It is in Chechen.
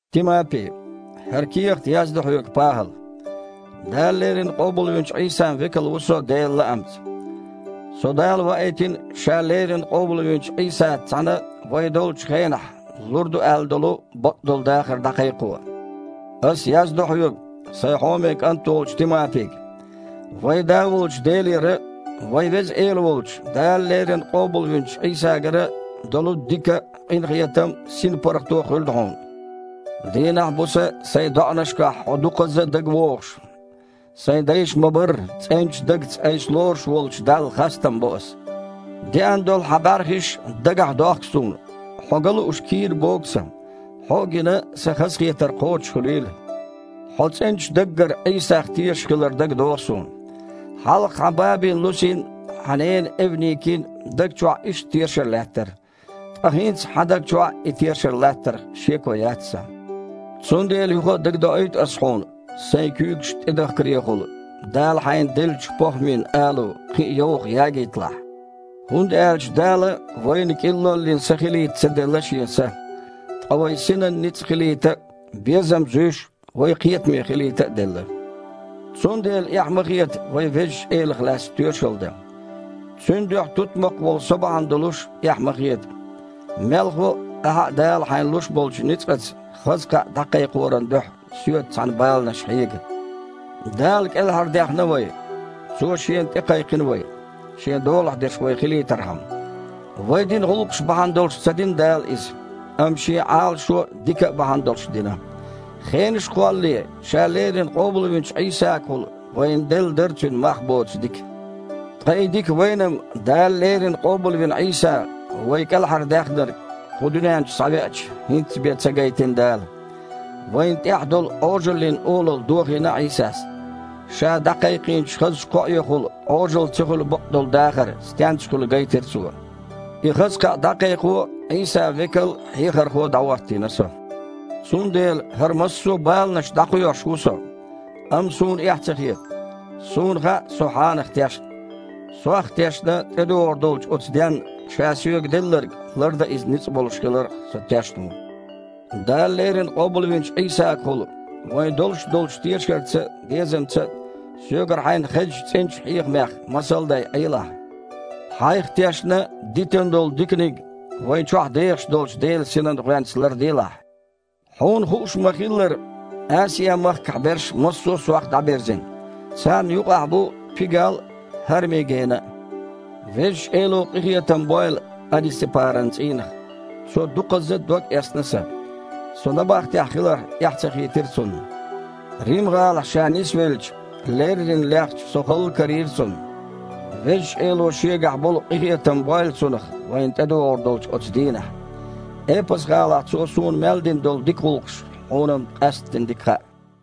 Тимапи, хІара кехат яздо хьоьга ПахІала. Дала леррина къобалвинчу Іийсан векал ву со Делан лаамца. Со Дала ваийтина Ша леррина къобалвинчу Іийсаца цхьаьна вай долчу хенахь лур ду аьлла долу бакъдолу дахар дІакхайкхо. Ас яздо хьоьга, сайн хьоме кІант волчу Тимапига. Вайн Да волчу Делера а, вайн Веза Эла волчу, Дала леррина къобалвинчу Іийсагара а долу дика а, къинхетам а, синпаргІато а хуьлда хьуна. Дийнахь а, буса а сайн доІанашкахь хьо дукхазза а дагавогІуш, сан дайша ма-барра, цІеначу дагца айса лоруш волчу Далла хастам бо ас. Деана долу хьан бІаьрхиш дагахьдохку суна. Хьо ган лууш кийра богу сан. Хьо а гина, сан хазахетар кхочушхуьлийла. Хьо цІеначу даггара Іийсах тешар дагадогІу суна. Хьалха хьан бабин Лусин а, хьан ненан Эвникин а даг чохь иштта тешар лаьттара. Ткъа хІинца хьан даг чохь а и тешар латтарх шеко яц сан. Цундела юха а дагадоуьйту ас хьуна, сайн куьйгаш тІедахкарехула, Дала хьайна деллачу похІмин алу кхин а йовха ягийталахь. ХІунда аьлча Дала вайна кІиллоллин са хилийта ца делла Шен Са, ткъа вайн синан ницкъ хилийта а, безам зуьйш а, вай кхетаме хилийта а делла. Цундела эхь ма хета вайн Везачу Элах лаьцна тоьшалла дан. Цуьнан дуьхьа тутмакх волу со бахьана долуш а эхь ма хета. Мелхо а, ахьа а Дала хьайна луш болчу ницкъаца хаза кхаъ дІакхайкхоран дуьхьа соьца цхьаьна баланаш хьега. Дала кІелхьардаьхна вай. Цо Шена тІекхайкхина вай, Шен долахь дерш вайх хилийтархьама. Вай дина гІуллакхаш бахьана долуш ца дина Дала иза, амма Шен Іалашо а, дика а бахьана долуш дина. Хенаш а кхоллале, Ша леррина къобалвинчу Іийсагахула вайна делла дара Цуьнан мах боцу дика. Ткъа и дика вайна-м Дала леррина къобалвина Іийса, вай КІелхьардаьхнарг, кху дуьнен чу схьавеача, хІинцца бен ца гайтина Дала. Вайна тІехь долу Іожаллин олалла дохийна Іийсас. Ша дІакхайкхийнчу хазачу кхоэхула Іожалла ца хуьлу бакъдолу дахар стенца хуьлу гайтира Цо. И хаза кхаъ дІакхайкхо Іийсан векал а, хьехархо а дІахІоттийна со. Цундела хІара массо а баланаш дІакхоьхьуш ву со. Амма суна эхь ца хета. Суна хаьа со Хьанах тешна. Сох а тешна, тІедогІур долчу оцу денна Ша соьга делларг лардан Иза ницкъ болуш хиларх со тешна ву. Дала леррина къобалвинчу Іийсагахула вайн долуш долчу тешарца а, безамца а соьгара хьайна хезначу цІеначу хьехамех масал а дай, Іелахь. Хьайх а тешна, дитина долу диканиг вайн чохь дехаш долчу Делан Синан гІоьнца ларделахь. Хьуна хууш ма-хиллара, Асиа-махкахь берш массо а сох дІабирзина. Царна юкъахь бу Пигал а, ХІарми-Гена а. Везачу Эло къинхетам бойла Анисапаран цІийнах. Цо дукхазза а догъэцна сан. Со набахтехь хиларх эхь ца хийтира цунна. Рим-гІалахь ша нисвелча, леррина лехча, со халла карийра цунна. Везачу Эло Шегахь болу къинхетам бойла цунах вайна тІедогІур долчу оцу дийнахь. Эпас-гІалахь цо суна мел дина долу дика гІуллакхаш хьуна-м къаьсттина дика хаьа.